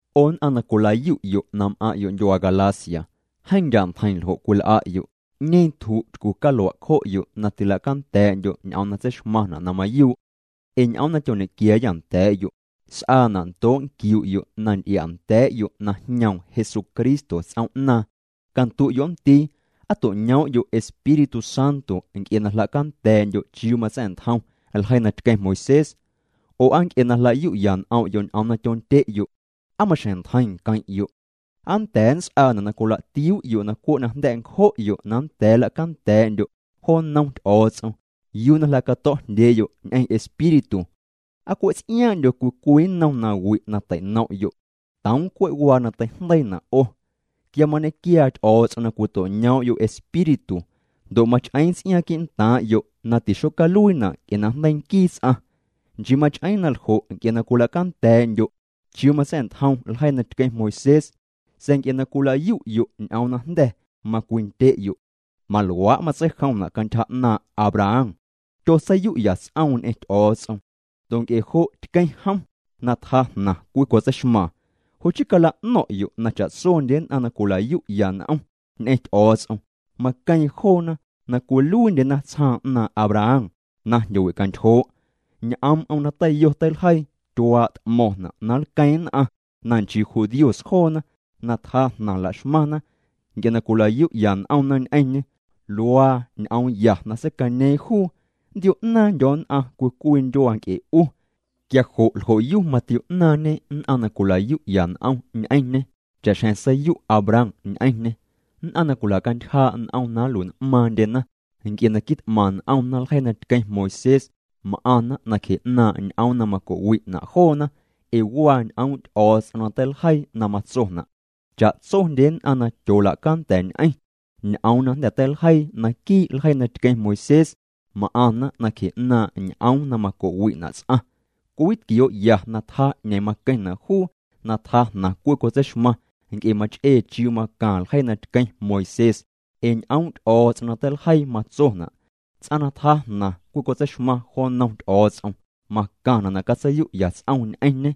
'O nn'aⁿ na cwila'yu'yo' na m'aⁿ'yo' ndyuaa Galacia, jeeⁿ ndya' ntjeiⁿ ljo' cwil'a'yo'. ¿'Ñeeⁿ tju' tycu calua' cjo'yo' na tilacanda̱a̱'ndyo' ñ'oom na tseixmaⁿna' na mayuu'? Ee ñ'oom na tyoñequiaayâ nda̱a̱'yo' s'aana' ndoo' nquiu'yo' na nty'ia'nda̱a̱'yo' na jñoom Jesucristo ts'oom'naaⁿ. Candu'yo' nndii. ¿Aa to'ñoom'yo' Espíritu Santo nc'e na jla'canda̱a̱'ndyo' chiuu matsa̱'ntjom ljeii na tqueⁿ Moisés, oo aa nc'e na jla'yu'ya n'om'yo' ñ'oom na tyondye'yo'? ¿Aa maxjeⁿ ntjeiⁿ nqueⁿ'yo'? ¿Aa nnda̱a̱ nts'aana' na cwila'tiuu'yo' na cwe' najnda̱' ncjo'yo' na nnda̱a̱ nla'canda̱a̱'ndyo' jo nnom Ty'o̱o̱ts'om yuu na jla'cato̱'jndyee'yo' ñ'eⁿ Espíritu? ¿Aa cwe' ts'iaaⁿ'ndyo cwii cwii nnom nawi' na teinom'yo'? Toom cwe' waa na teijndeiina' 'o. Quia mañequiaa Ty'o̱o̱ts'om na cwito'ñoom'yo' Espíritu ndo' mach'eeⁿ ts'iaaⁿ quii'ntaaⁿ'yo' na tixocaluiina' nc'e na jndeii nquii ts'aⁿ, nchii mach'eeⁿ na ljo' ee na cwila'canda̱a̱'ndyo' chiuu matsa̱'ntjom ljeii na tqueⁿ Moisés, sa̱a̱ nc'e na cwila'yu'yo' ñ'oom na jnda̱ macwindye'yo'. Maluaa' matseijomna' cantyja 'naaⁿ' Abraham. Tyotseiyu'ya ts'oom ñ'eⁿ Ty'o̱o̱ts'om, ndo' nc'e jo' tqueⁿ jom na tjaa jnaⁿ cwicotseixmaaⁿ. Jo' chii cala'no̱ⁿ'yo' na cha'tsondye nn'aⁿ na cwila'yu'ya n'om ñ'eⁿ Ty'o̱o̱ts'om, maqueeⁿ joona na cwiluiindyena tsjaaⁿ 'naaⁿ' Abraham na jndyowicantyjoo'. Ñ'oom'm na teiyo teiljeii, tyuaa' t'mo̱ⁿna' na nlqueeⁿ nn'aⁿ na nchii judíos joona na tjaa jnaⁿ la'xmaⁿna nc'e na cwila'yu'ya n'omna ñ'eⁿñê. Luaa ñ'oomya na seicañeeⁿ juu: “Nndio̱'naaⁿndyo̱ nn'aⁿ cwii cwii ndyuaa nc'e 'u.” Quia jo' ljo'yu matio'naaⁿñê nn'aⁿ na cwila'yu'ya n'om ñ'eⁿñê cha'xjeⁿ seiyu' Abraham ñ'eⁿñê. Nn'aⁿ na cwilacantyjaa' n'om na nlui'n'maaⁿndyena nc'e na quit'maⁿ n'omna ljeii na tqueⁿ Moisés m'aⁿna nacje 'naaⁿ' ñ'oom na maco'wi'na' joona. Ee waa ñ'oom' Ty'o̱o̱ts'om na teiljeii na matsona': “Cha'tsondye nn'aⁿ na tyoola'canda̱ñ'eⁿ ñ'oom na jnda̱ teiljeii naquii' ljeii na tqueⁿ Moisés, m'aⁿna nacje 'naaⁿ' ñ'oom na maco'wi'na' ts'aⁿ.” Cwiwitquioo'ya na tjaa 'ñeeⁿ maqueⁿna' juu na tjaa jnaⁿ cwicotseixmaⁿ nc'e mach'ee chiuu macaⁿ ljeii na tqueⁿ Moisés, ee ñ'oom' Ty'o̱o̱ts'om na teiljeii matsona': “Ts'aⁿ na tjaa jnaⁿ cwicotseixmaⁿ jo nnom Ty'o̱o̱ts'om, macaⁿna' na catseiyu'ya ts'om ñ'eⁿñê.”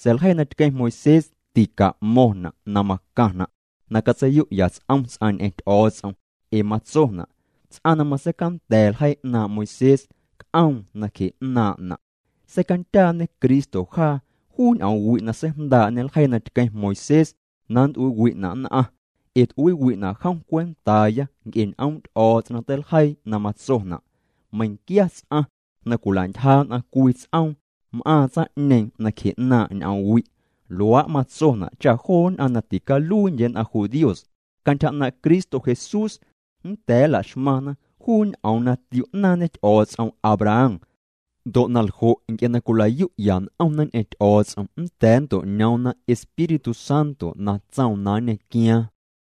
Sa̱a̱ ljeii na tqueⁿ Moisés tica'mo̱ⁿna' na macaⁿna' na catseiyu'ya ts'om ts'aⁿ ñ'eⁿ Ty'o̱o̱ts'om, ee matsona': “Ts'aⁿ na matseicanda̱ ljeii 'naaⁿ' Moisés, c'oom na cje'naaⁿ'na'.” Seicandyaañe Cristo jaa juu ñ'oomwi' na seijndaa'ñe ljeii na tqueⁿ Moisés na nnt'uiiwi'na' nn'aⁿ, ee t'uiiwi'na' jom cwentaaya nc'e ñ'oom' Ty'o̱o̱ts'om na teiljeii na matsona': “Meiⁿquia ts'aⁿ na cwila'ntyja nn'aⁿ cwii ts'oom, m'aaⁿ tsaⁿ'ñeeⁿ nacje 'naaⁿ' ñ'oomwi'.” Luaa' matsona' cha joo nn'aⁿ na ticaluiindye nn'aⁿ judíos, cantyja 'naaⁿ' Cristo Jesús nnda̱a̱ nla'xmaⁿna juu ñ'oom na tio'naaⁿñe Ty'o̱o̱ts'om Abraham, ndo' naljo', nc'e na cwila'yu'ya n'omna ñ'eⁿ Ty'o̱o̱ts'om nnda̱a̱ nnto'ñoomna Espíritu Santo na tsoom na nñequiaaⁿ.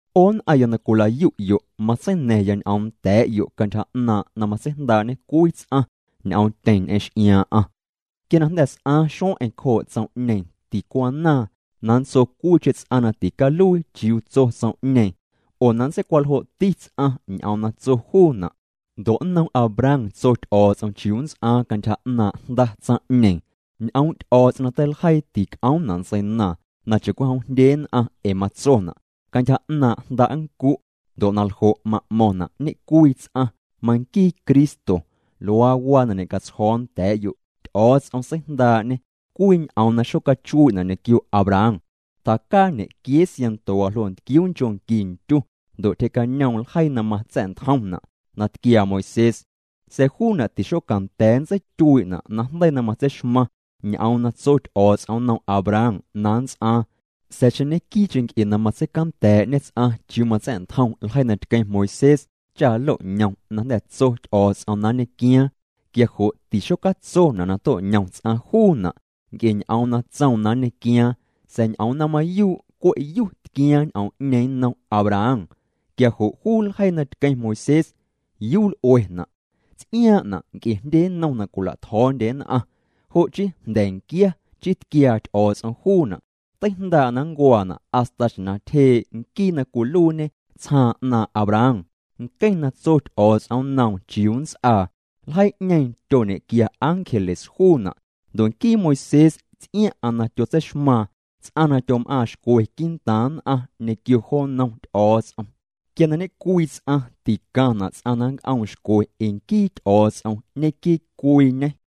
'O nn'aⁿya na cwila'yu'yo', mantseina̱ⁿya ñ'oom nda̱a̱'yo' cantyja 'naaⁿ' na matseijndaa'ñe cwii ts'aⁿ ñ'oomtyeⁿ ñ'eⁿ x'iaaⁿ'aⁿ. Quia na jnda̱ s'aaⁿ xueⁿ'eⁿ cjoo' tsom'ñeeⁿ, ticwanaaⁿ na nntso cwiicheⁿ ts'aⁿ na ticaluii chiuu tso tsom'ñeeⁿ oo na nntseicwaljo'ti ts'aⁿ ñ'oom na tso juuna'. Ndo' nnom Abraham tso Ty'o̱o̱ts'om chiuu nts'aaⁿ cantyja 'naaⁿ' jnda tsaⁿ'ñeeⁿ. Ñ'oom' Ty'o̱o̱ts'om na teiljeii tic'oomna' ntseinaaⁿ, na cha'cwijom jndye nn'aⁿ ee matsona': “Cantyja 'naaⁿ' jnda' nncu'”, ndo' naljo', ma'mo̱ⁿna' ñecwii ts'aⁿ, manquii Cristo. Luaa waa na ñe'catsjo̱o̱ nda̱a̱'yo'. Ty'o̱o̱ts'om seijndaa'ñê cwii ñ'oom na xocachuii'na' ñequio Abraham. Tjacaa ñequiee sianto waljoo' ntquiuu nchoo' nqui ndyu ndo' tyjee'cañoom ljeii na matsa̱'ntjomna' na tquiaa Moisés. Sa̱a̱ juuna' tixocanda̱a̱ nntseityuii'na' najndeii na matseixmaⁿ ñ'oom na tso Ty'o̱o̱ts'om nnom Abraham na nnts'aaⁿ. Sa̱a̱ xeⁿ ñequii'cheⁿ nc'e na matseicanda̱a̱'ñe ts'aⁿ chiuu matsa̱'ntjom ljeii na tqueⁿ Moisés cha nloñom na jnda̱ tso Ty'o̱o̱ts'om na nñequiaaⁿ quia jo' tixocatsona' na to'ñom ts'aⁿ juuna' nc'e ñ'oom na tsoom na nñequiaaⁿ sa̱a̱ ñ'oom na mayuu' cwe' yu tquiaaⁿ ñ'oom'ñeeⁿ nnom Abraham. Quia jo' juu ljeii na tqueⁿ Moisés ¿yuu l'uena'? Ts'iaaⁿ'na' nc'e jndye nnom na cwila'tjo̱o̱ndye nn'aⁿ, jo' chii jnda̱nquia chii tquiaa Ty'o̱o̱ts'om juuna'. Teijndaa' na nncuaana' hasta xjeⁿ na tyjee' Nquii na cwiluiiñe tsjaaⁿ 'naaⁿ' Abraham, nqueⁿ na tso Ty'o̱o̱ts'om nnoom chiuu nnts'aa. Ljeii'ñeeⁿ tyoñequia ángeles juuna', ndo' nquii Moisés ts'iaⁿ'aⁿ na tyotseixmaaⁿ ts'aⁿ na tyom'aaⁿ xcwe quii'ntaaⁿ nn'aⁿ ñequio jo nnom Ty'o̱o̱ts'om. Quia na ñecwii ts'aⁿ, ticaⁿna' ts'aⁿ na nnc'oom xcwe ee nquii Ty'o̱o̱ts'om ñequii cwiiñê.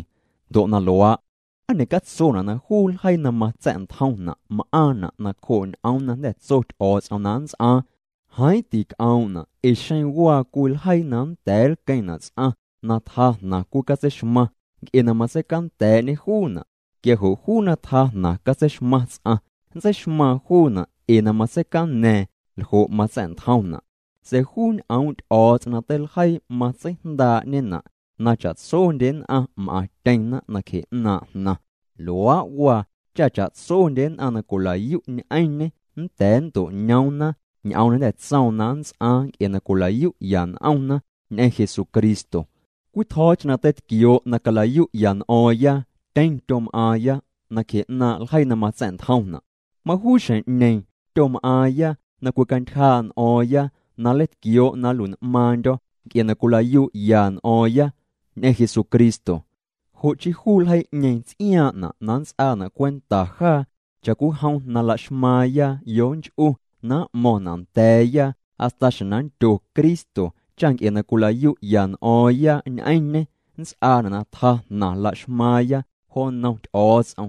Ndo' na luaa', ¿aa ñe'catsona' na juu ljeii na matsa̱'ntjomna' m'aaⁿna' nacjoo' ñ'oom na jnda̱ tso Ty'o̱o̱ts'om na nnts'aaⁿ? Jeeⁿ tic'oom'na' ee xeⁿ waa cwii ljeii na nnda̱a̱ nlqueⁿna' ts'aⁿ na tjaa jnaⁿ cwicatseixmaⁿ nc'e na matseicanda̱a̱'ñe juuna', quia jo' juu na tjaa jnaⁿ catseixmaⁿ ts'aⁿ, nntseixmaaⁿ juuna' ee na matseicaña̱a̱ⁿ ljo' matsa̱'ntjomna'. Sa̱a̱ juu ñ'oom' Ty'o̱o̱ts'om na teiljeii matseijndaa'ñena' na cha'tsondye nn'aⁿ m'aⁿtyeⁿna nacje 'naaⁿ' jnaⁿ. Luaa' waa cha cha'tsondye nn'aⁿ na cwila'yu' ñ'eⁿñê nnda̱a̱ nnto'ñoomna ñ'oom na jnda tsoom na nnts'aaⁿ nc'e na cwila'yu'ya n'omna ñ'eⁿ Jesucristo. Cwii tjo̱o̱cheⁿ na teitquioo' na cala'yu'ya n'o̱o̱ⁿya, tyeⁿ tyom'aaⁿya nacje 'naaⁿ' ljeii na matsa̱'ntjomna'. Majuu xjeⁿ'ñeeⁿ tyom'aaⁿya na cwicantyjaa' n'o̱o̱ⁿya na nleitquioo' na nlui'n'maaⁿndyo̱ nc'e na cwila'yu'ya n'o̱o̱ⁿya ñ'eⁿ Jesucristo. Jo' chii juu ljeii'ñeeⁿ ts'iaaⁿ'na' na nnts'aana' cwenta jaa cha'cwijom na laxmaaⁿya yonch'u na m'mo̱ⁿna' nda̱a̱ya hasta xjeⁿ na nndyo Cristo, cha nc'e na cwila'yu'ya n'o̱o̱ⁿya ñ'eⁿñê nnts'aana' na tjaa jnaⁿ la'xmaaⁿya jo nnom Ty'o̱o̱ts'om.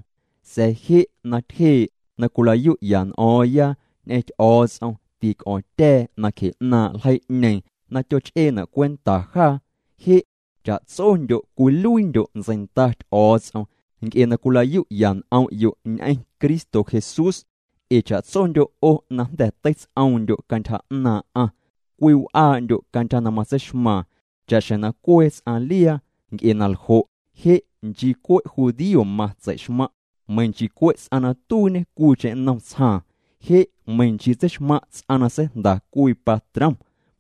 Sa̱a̱ je' na tyjee' na cwila'yu'ya n'o̱o̱ⁿya ñ'eⁿ Ty'o̱o̱ts'om, tic'o̱ⁿtya̱a̱ nacje 'naaⁿ' ljeii'ñeeⁿ na tyoch'eena' cwenta jaa. Je' cha'tsondyo' cwiluiindyo' ntseinda Ty'o̱o̱ts'om nc'e na cwila'yu'ya n'om'yo' ñ'eⁿ Cristo Jesús. Ee cha'tsondyo' 'o na jnda̱ teits'oomndyo' cantyja 'naaⁿ'aⁿ, cwiw'aa'ndyo' cantyja na matseixmaaⁿ cha'xjeⁿ na cwee ts'aⁿ liaa. Nc'e na ljo', je' nchii cwe' judío matseixmaⁿ', meiⁿ nchii cwe' ts'aⁿ na tuiiñe cwiicheⁿ nnom tsjaaⁿ. Je' meiⁿ nchii tseixmaⁿ' ts'aⁿ na seijnda cwii patrom,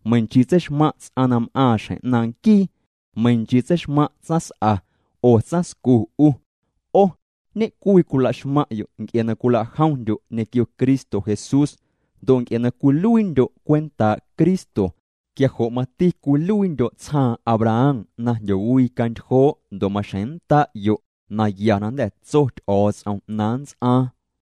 meiⁿnchii tseixmaⁿ' ts'aⁿ na m'aaⁿ xjeⁿ 'naaⁿ' nquii, meiⁿ nchii tseixmaⁿ' tsaⁿs'a oo tsaⁿscu 'u. 'O ñe'cwii cwilaxmaⁿ'yo' nc'e na cwila'jomndyo' ñequio Cristo Jesús. Ndo' nc'e na cwiluiindyo' cwentaa' Cristo, quia jo' mati cwiluiindyo' tsjaaⁿ Abraham na jndyowicantyjoo' ndo' maxjeⁿ nnda'yo' naya na jnda̱ tso Ty'o̱o̱ts'om na nnts'aaⁿ.